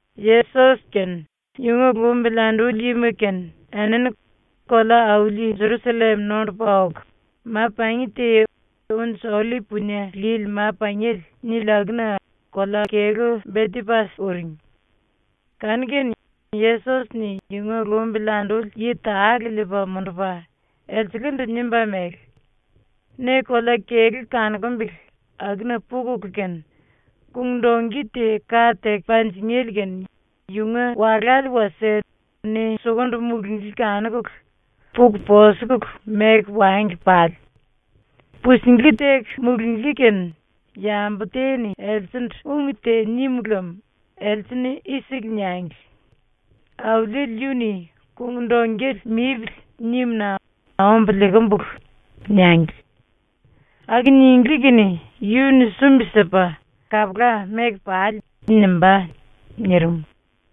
⸤Yesos kene yunga lumbili anduli yima kene⸥ enini kolea-auli Jerusallem nondupa oku, ma-pangi te ‘Unji Ollip Punie Lili Ma-Pangiele’ nili akuna kolea-kelú Betepas uring. Kanu-kene Yesos-ni yunga lumbili anduli yi tale liipa mundupa, Elselendu nimba mele: “Ne kolea-kelú kanukumbele akuna pukulu kene kung-dongki te ka teku panjingéle kene yunga walále wasie ne sukundu mulunglí kanukulu, puku posukulu meku wangli pale. Pusinglí teku mulunglí kene yambu te-ni elsendu ung te nim lem else-ni i-siku niangli: “Auliele yu-ni ‘Kung-dongkele mipili.’ nimu-na ombu liikimbulu.” niangli. Aku ninglí kene yu-ni sumbi-sipa “Kapula, meku pale.” nimbá.” nirim.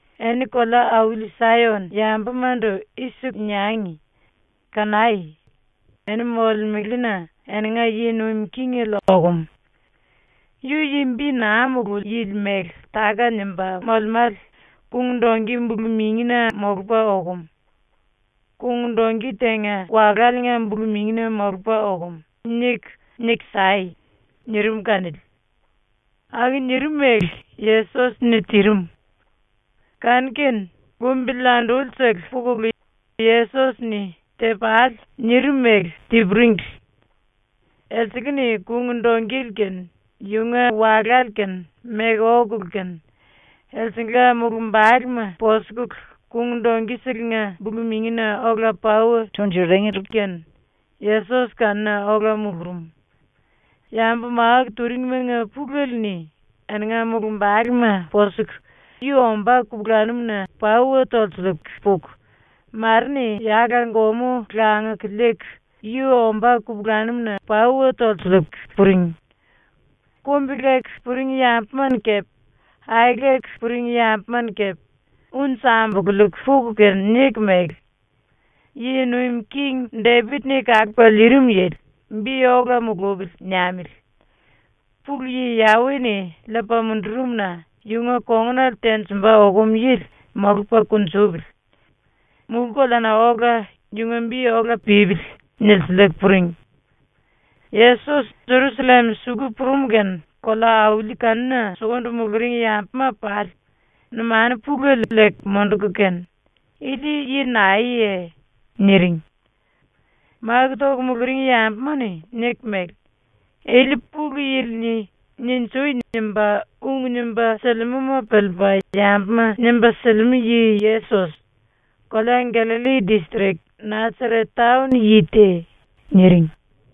“Eni kolea-auli Sayon yambumandu i-siku niangi: “Kanai! Eni molemelena eninga yi nuim kingele okum. Yu yi bi naa mululi yili mele táka-nimba molemále kung-dongki bulu-mingina molupa okum. Kung-dongki tenga waláliinga bulu-mingina molupa okum.” niku, niku sai.” nirim kanili. ⸤Aku nirim mele Yesos-ni tirim.⸥ Kanu-kene lumbili andulisele pukulu Yesos-ni “Te-pale.” nirim mele ti-puringli. Elsele-ni kung-dongkele kene yunga walále kene meku okulu kene, elsengla mulumbalema posukulu, dongki-selenga bulu-mingina ola pauwa tunjuringli kene Yesos kanuna ola mulurum. Yambu máku turingmanga pulele-ni eninga mulumbalema posuku yu ombá kupulanum-na pauwa tolsiliiku puku, mare-ni yala-gomú languku liiku yu ombá kupulanum-na pauwa tolsiliiku puring. Kumbi-leku puring yambuma-ni kepe aeleku puring yambuma-ni kepe unji ambululiiku puku kene niku mele: “⸤Yi Nuim King⸥ Depit-ni Kalupa Liirim Yili ‘Bi ola mulupili.’ niamili. Pulu Yi Yawe-ni liipa mundurum-na yunga kongunale tenjimba okum yili molupa kunjupili. Mulú-koleana ola yunga bi ola pípili.” nilsiliiku puring. Yesos Jerusallem suku purum kene kolea-auli kanuna sukundu muluring yambuma pali numanu pulele liiku munduku kene “Ili yi naeye?” niring. Máku toku muluring yambuma-ni niku mele: “Ili Pulu Yili-ni “Ninjui!” nimba ung nimba silimúma piliipa yambuma nimba silimú yi-Yesos, kolea Gallalli distrik Nasaret taon yi te.” niring.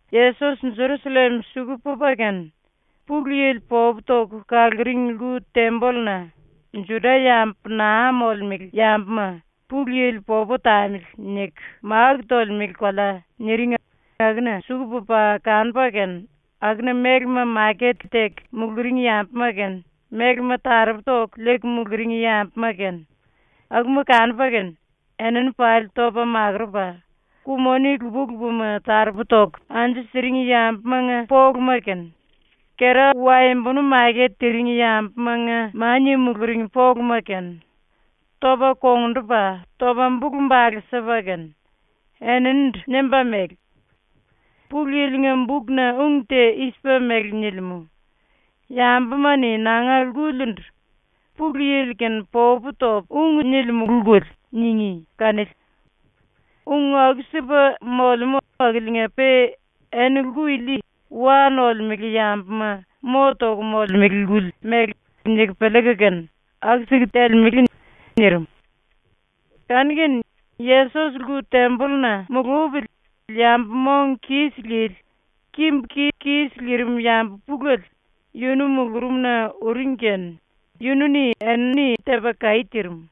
Yesos ⸤Jerusallem suku pupa kene,⸥ Pulu Yili popu toku kaluring lku-tembolluna ⸤“Juda-yambu naa molemele yambuma ‘Pulu Yili popu tamili.’ niku máku tolemele kolea” niring akuna⸥ suku pupa kanupa kene akuna mélema maket teku muluring yambuma kene, mélema taropu toku liiku muluring yambuma kene akuma kanupa kene enini pali topa makurupa, ku-moni lupa-lupama taropu toku anju siring yambumanga poluma kene, kera-waembonu maket tiring yambumanga mania muluring poluma kene, topa kongndupa, topa bulu-bale sipa kene, eninindu nimba mele: “Pulu Yili-nga bukna ung te i-sipa mele nilimú: ‘Yambuma-ni nanga lkulindu “Pulu Yili-kene popu topu ung nilimulu lkuli.” ningí.’ kanili. Ung aku-sipa molemú akiliinga-pe eni lku ili ‘wa nolemele yambuma mo toku molemele lkuli’ mele niku piliiku kene aku-siku telemele.” nirim. Kanu-kene Yesos lku-tembolluna mulupili yambu mong kis lili, kimbu-ki kis lirim yambu pulele yunu mulurumna uring kene yunu-ni enini tepa kaí tirim.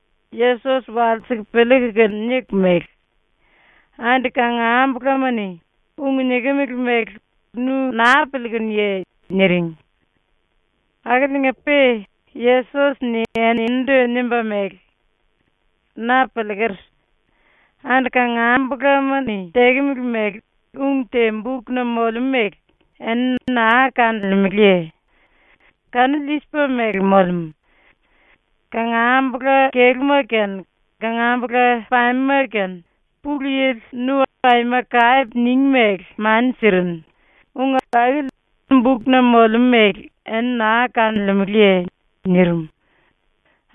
Yesos walsiku piliiku kene niku mele: “Andi kangambulama-ni ung nikimili mele nu ⸤naa⸥ piliikunuye?” niring. ⸤Akiliinga-pe⸥ Yesos-ni eninindu nimba mele: “Na piliiker. ⸤Andi kangambulama-ni tekemele mele⸥ ung te bukna molemú mele eni naa kanolemeleye? Kanili i-sipa mele molemú: ‘Kangambula-kelúma kene kangambula-pamema kene ⸤Pulu Yili⸥ nu aima kape ningí mele mani sirinu.’ ung akili bukna molemú mele eni naa kanolemeleye?” nirim.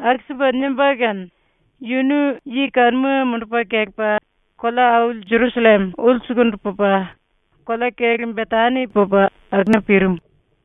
Aku-sipa nimba kene yunu yi kanuma mundupa kelepa kolea-auli ⸤Jerusallem⸥ ulsukundu pupa kolea-kelú Betani pupa akuna pirim.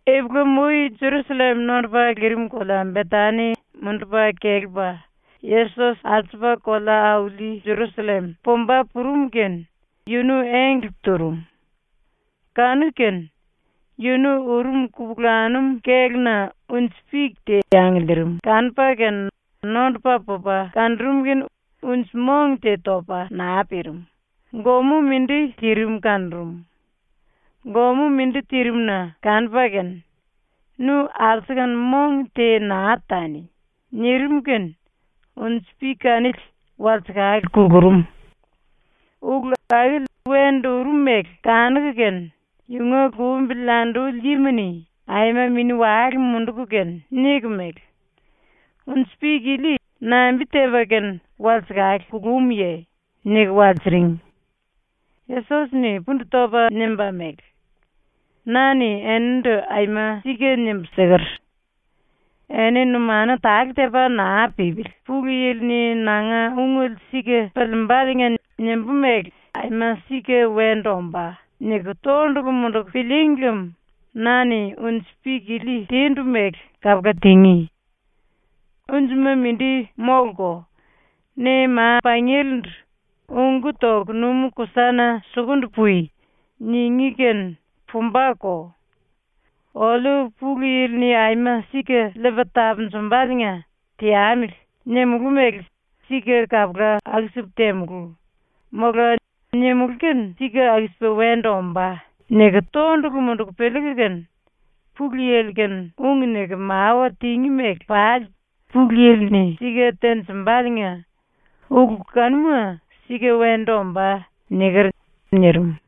Ipulam-ui ⸤Jerusallem nondupa lirim kolea Betani mundupa kelepa Yesos⸥ alsupa kolea-auli ⸤Jerusallem⸥ pumba purum kene yunu engle turum. Kanu-kene yunu urum kupulanum kéluna unji-pik te angiliirim kanupa kene nondupa pupa kanurum kene unji-mong te topa naa pirim, gomú mindi tirim kanurum. ⸤Gomú mindi tirimu-na⸥ kanupa kene “Nu alsukunu mong te naa tani.” nirim kene unji-pik kanili walsekale kulurum. Ulu akili wendu urum mele kanuku kene yunga lumbili anduli yima-ni aima mini-wale munduku kene niku mele: “Unji-pik ili nambi-tepa kene walsekale kulumuye?” niku walsiring. Yesos-ni pundu topa nimba mele: “Na-ni enindu aima sika nimbu siker: “Eni numanu tale tepa naa pípili ⸤Pulu Yili-ni nanga ungele sika piliimbaliinga nimbú mele ‘aima sika wendu ombá.’ niku⸥ tondulu munduku pilííngi lem na-ni unji-pik ili tindu mele kapula tingí. Unjima mindi móluko. Ne ma-pangielendu “Ungú toku numú-kusana sukundu pui.” ningí kene pumbako. ‘Oliu ⸤Pulu Yili-ni aima sika liipa tapunjumbaliinga ‘Teamili.’ nimulú mele sika kapula aku-sipu temulú.’ mola ‘Nimulú kene sika aku-sipa wendu ombá.’ niku⸥ tondulu munduku piliiku kene ⸤Pulu Yili-kene⸥ ung niku mawa tingí mele pali Pulu Yili-ni sika tenjimbaliinga ulu kanuma sika wendu ombá.” niker.” nirim.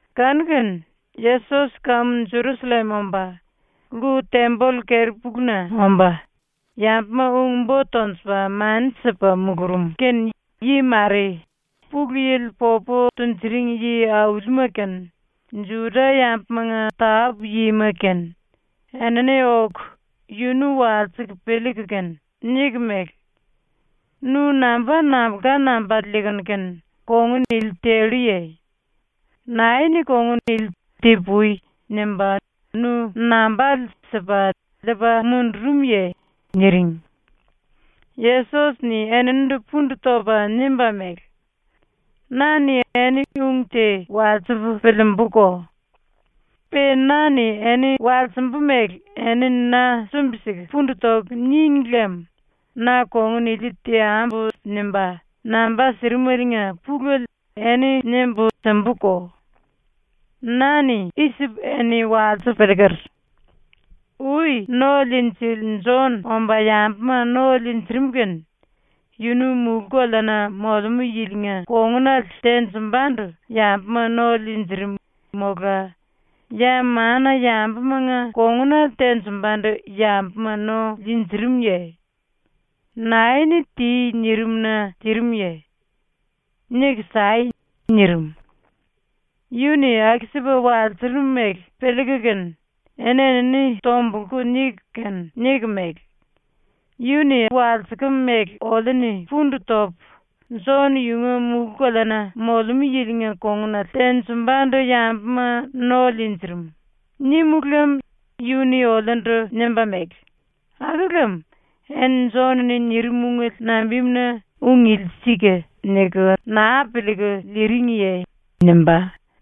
Kanu-kene Yesos ⸤kamu Jerusallem omba⸥ lku-temboll keri-puluna omba, yambuma ung-bo tonjupa mani sipa mulurum kene yi mare, Pulu Yili popu tunjuring yi-aulima kene, Juda-yambumanga tápu-yima kene enini oku yunu walsiku piliiku kene niku mele: “Nu namba nambulka nambale liikunu kene kongun ili telluye? Nae-ni kongun ili ‘Ti-pui.’ nimba nu nambale sipa liipa mundurumye?” niring. Yesos-ni eninindu pundu topa nimba mele: “Na-ni eni ung te walsipu piliimbuko. Pe na-ni eni walsimbu mele eni na sumbi-siku pundu toku níngi lem ‘Na kongun ili teambu.’ nimba namba sirimeliinga pulele eni nimbu simbuko. ⸤Na-ni i-sipu eni walsipu piliiker:⸥ Ui ⸤No-Liinjili⸥ Jon omba yambuma no liinjirim kene yunu mulú-koleana molemú yilinga kongunale tenjimbandu yambuma no liinjirim mola ya mana-yambumanga kongunale tenjimbandu yambuma no liinjirimuye? ⸤Nae-ni “Ti.” nirim-na tirimuye? Niku sai.⸥” nirim. ⸤Yu-ni aku-sipa walsurum mele piliiku kene⸥ eni-enini tombulku niku kene niku mele: “Yu-ni walsikem mele oliu-ni pundu topu, “⸤Jon⸥ yunga mulú-koleana ⸤molemú yilinga kongunale tenjimbandu yambuma no liinjirim⸥.” nímulu lem yu-ni oliundu nimba mele: “Aku lem eni Jon-ni nirim ungele nambimuna ‘Ung ili sika.’ niku naa piliiku liiringiye?” nimbá.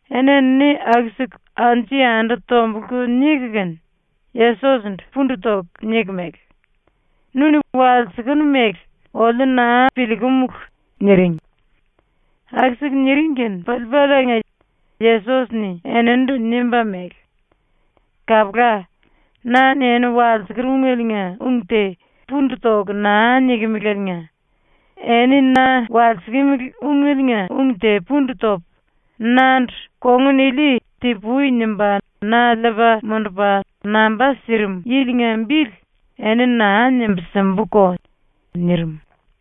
⸤Eni-enini aku-siku anju-yandu tombulku niku kene⸥, Yesos-ndu pundu toku niku mele: “⸤Nu-ni walsikenu mele⸥ oliu naa piliikumulu.” niring. Aku-siku niring kene piliipaliinga Yesos-ni eninindu nimba mele: “Kapula. ⸤Na-ni eni walsiker ungeliinga ung te pundu toku naa nikimilieliinga⸥ eni na walsikimili ungeliinga ung te pundu topu nandu kongunili ‘Ti-pui.’ nimba na liipa mundupa namba sirim yilinga bili eni naa nimbu simbuko.” ⸤nirim.⸥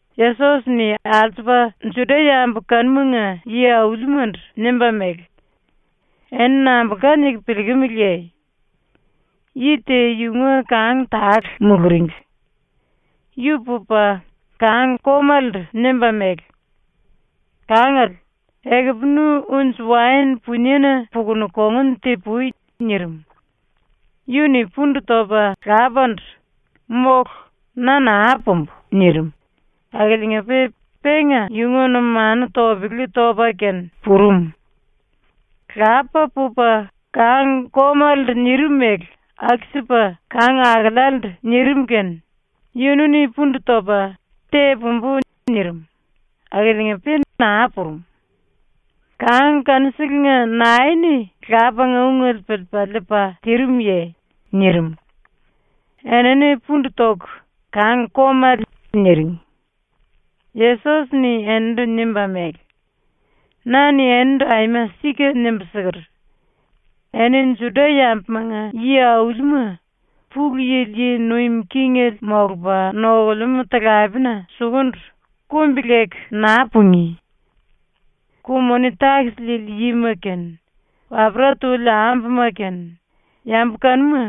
⸤Yesos-ni alsupa Juda-yambu kanumanga yi-aulimandu nimba mele:⸥ “Eni nambulka niku piliikimiliye? Yi te yunga kang tale muluringli. Yu pupa kang-komalendu nimba mele: “Kangale, ekupu nu unji-waen puniena pukunu kongun ti-pui.” nirim. “Yu-ni pundu topa lapandu “Mólu, na naa pumbu.” nirim, akiliinga-pe penga yunga numanu topele topa kene purum. “Lapa pupa kang-komalendu nirim mele aku-sipa kang-akelealendu nirim ⸤kene⸥ yunu-ni pundu topa “Te-pumbu.” nirim, akiliinga-pe naa purum. “Kang kanuselenga nae-ni lapanga ungele piliipa liipa tirimuye?” nirim. Enini pundu toku “Kang-komale.” niring. Yesos-ni eninindu nimba mele: “Na-ni enindu aima sika nimbu siker: “Eni ⸤Juda-yambumanga yi-aulima⸥ Pulu Yili yi nuim kingele molupa nokulemú talapena sukundu ⸤kumbi-leku naa pungí⸥. Ku-moni-takis liili yima kene wapera tuli ambuma kene ⸤yambu kanuma,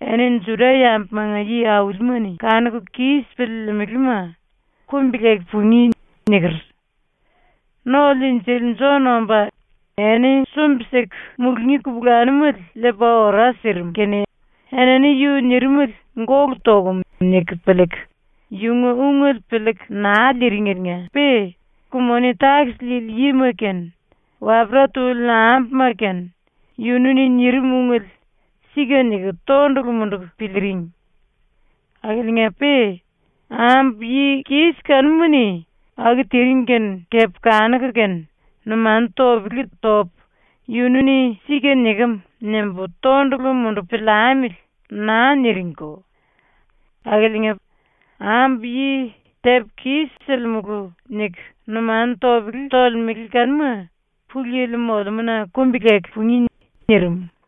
eni Juda-yambumanga yi-aulima-ni kanuku kis piliilimilima⸥ kumbi-leku pungí.” niker. ⸤No-Liinjili⸥ Jon omba eni sumbi-siku mulungí kupulanumele liipa ora sirim kene enini yu nirimele ‘Gólu tokum.’ niku piliiku yunga ungele piliiku naa liiringeliinga-pe ku-moni-takis liili yima kene wapera tuli ambuma kene yunu-ni nirim ungele ‘Sika’ niku tondulu munduku piliiring. Akiliinga-pe ambu yi kis kanuma-ni aku tiring kene kepe kanuku kene ‘Numanu topele topu ‘Yunu-ni sika nikem.’ nimbu tondulu mundupu piliamili.’ naa niringko. Akiliinga, ⸤ambu yi “Tepu kis-silimulu.” niku numanu topele tolemele kanuma Pulu Yili molemúna kumbi-leku pungí⸥.” ⸤nirim.⸥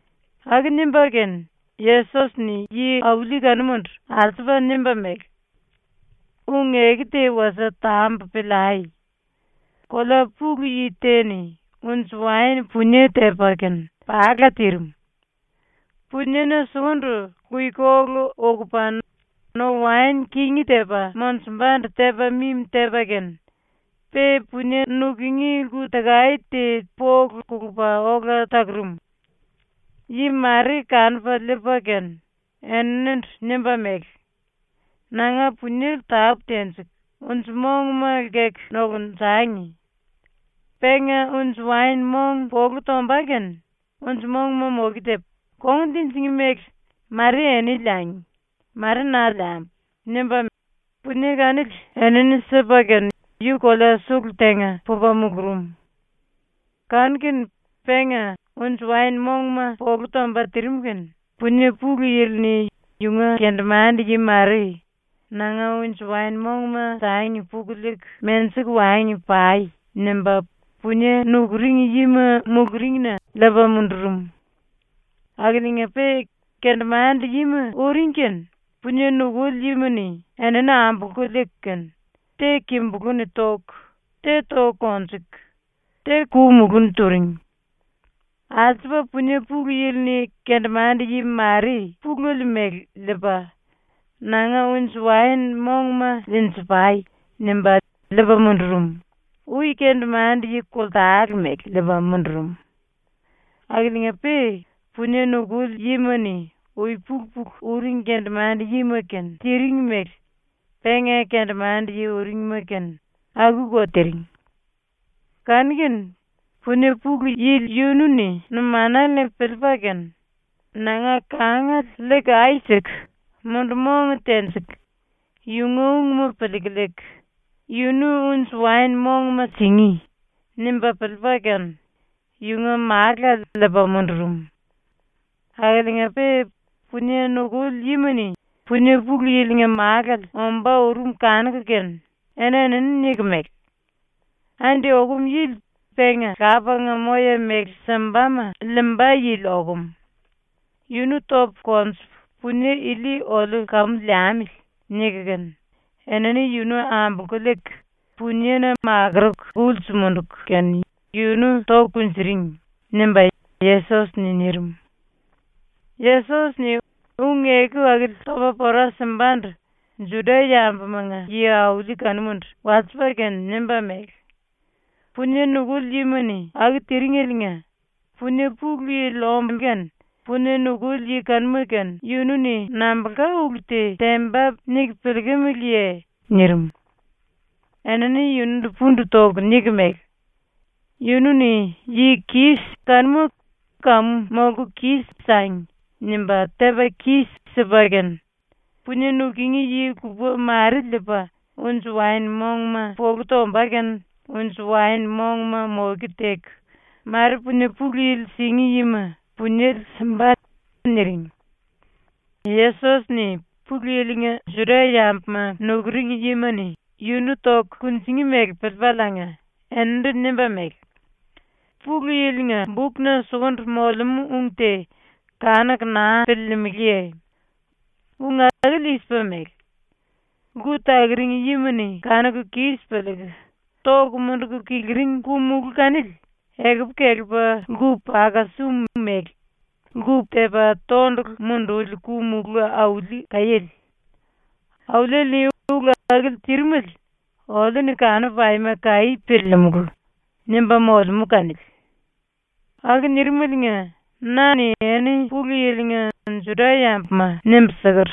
⸤Aku nimba kene Yesos-ni yi-auli kanumandu alsupa nimba mele:⸥ “Ung-eku te wasie tambu piliai: “Kolea pulu yi te-ni unji-waen punie tepa kene pala tirim. Puniena sukundu luikolu ukupa no-waen kingí tepa monjumbandu tepa mimi tepa kene pe punie nukungí lku-takae te polu kulupa ola takurum. Yi mare kanupa liipa kene eninindu nimba mele: “Nanga puniele tápu tenjiku unji-monguma lkeku nokunjangi. Penga unji-waen-mong polu tomba kene unji-monguma moke tepu, kongun tinjingí méle mare eni liangi mare na liambu.” nimba punie kanili enini sipa kene yu kolea ⸤sulu⸥ tenga pupa mulurum. Kanu-kene penga unji-waen-mongma polu tomba tirim kene punie pulu yili-ni yunga kendemande-yi mare “Nanga unji-waen-mongma sangi puku liiku menjiku wangi pai.” nimba punie nukuring yima muluringna liipa mundurum. Akiliinga-pe kendemande-yima ⸤uring kene⸥ punie nukuli yima-ni enini ambolku liiku kene te kimbulú-ni toku, te toku konjuku, te ku-mulú-ni turing. Alsupa punie pulu yili-ni kendemande-yi mare pulele mele liipa “Nanga unji-waen-mongma liinji-pai.” nimba liipa mundurum, ui kendemande-yi koltale mele liipa mundurum. Akiliinga-pe punie nukuli yima-ni ui-pulu-pulu uring kendemande-yima-kene tiring mele penga kendemande-yi uringma-kene akuko tiring. Kanu-kene punie pulu yili yunu-ni ⸤numanale-ni piliipa kene⸥ ‘Nanga kangale ai siku mundu-mong tenjiku yunga ungma piliiku liiku, yunu unji-waen-monguma singí.’ nimba piliipa kene yunga málale liipa mundurum. Akiliinga-pe punie nukuli yima-ni punie pulu yilinga málale ombá urum kanuku kene eni-enini niku mele: “Andi okum yili penga lapanga moya-méle simbama liimba yili okum. Yunu topu konjupu punie ili oliu kamu liamili.” niku kene enini yunu ambolku liiku puniena makuruku ulsu munduku kene yunu toku kunjuring.” ⸤nimba Yesos-ni nirim.⸥ ⸤Yesos-ni ung-eku akili topa pora simbandu Juda-yambumanga yi-auli kanumandu walsipa kene nimba mele:⸥ “Punie nukuli yima-ni aku tiringeliinga punie pulu yili omba kene punie nukuli yi kanuma-kene yunu-ni nambulka ulu te temba niku piliikimiliye?” nirim. Enini yundu pundu toku niku mele: “Yunu-ni yi-kis kanuma ‘kamu molku kis-sangi.’ nimba tepa kis-sipa kene punie nukungí yi lupa mare liipa unji-waen-mongma polu tomba kene unji-waen-monguma moke teku, mare punie pulu yili singí yima puniele simba.” niring. Yesos-ni ⸤Pulu Yili-nga Juda-yambuma nukuring yima-ni yunu toku kunjingí mele piliipaliinga⸥ eninindu nimba mele: “Pulu Yili-nga bukna sukundu molemú ung te kanuku naa piliilimiliye? ⸤Ung akili i-sipa mele:⸥ “Lku takuring yima-ni kanuku kis piliiku toku munduku kiliring ku-mulú kanili ekupu kelepa lku-paka-sum mele lku tepa tondulu munduli ku-mulú auli kaiéle. Auliele-ni ulu akili tirim oliu-ni kanupu aima kaí piliilimulu.” nimba molemú kanili. Aku ⸤nirim⸥ eliinga na-ni eni ⸤Pulu Yili-nga Juda-yambuma⸥ nimbu siker: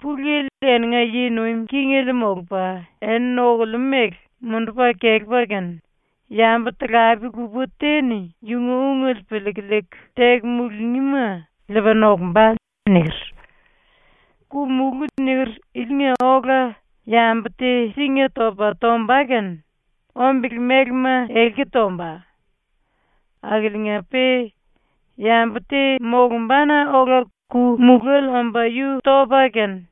“Pulu Yili eninga yi nuim kingele molupa eni nokulemú mele mundupa kelepa kene, yambu talape lupa te-ni yunga ungele piliiku liiku teku mulungíma liipa nokumba.” niker. (Ku-mulú ⸤niker⸥ ilinga ola yambu te singa topa tomba kene ombele-mélema elki tomba. Akiliinga-pe yambu te molumbana ola ku-mulále omba yu topa kene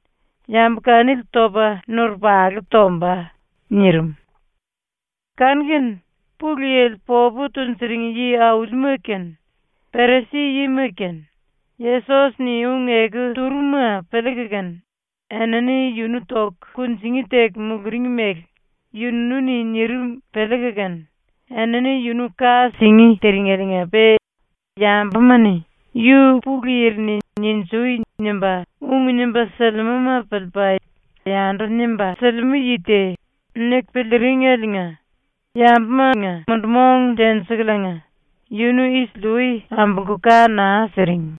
yambu kanili topa nurupalu tomba.)” nirim. Kanu-kene Pulu Yili popu tunjuring yi-aulima kene Perisi-yima kene Yesos-ni ung-eku turum-ma piliiku kene enini yunu toku kunjingí teku muluring mele yunu-ni nirim piliiku kene enini yunu ka singí tiringeliinga-pe yambuma-ni ‘Yu Pulu Yili-ni “Ninjui!” nimba ung nimba silimúma piliipa yandu nimba silimú yi te.’ niku piliiringeliinga yambuma mundu-mong tenjikuliinga yunu isili-ui ambolku ka naa siring.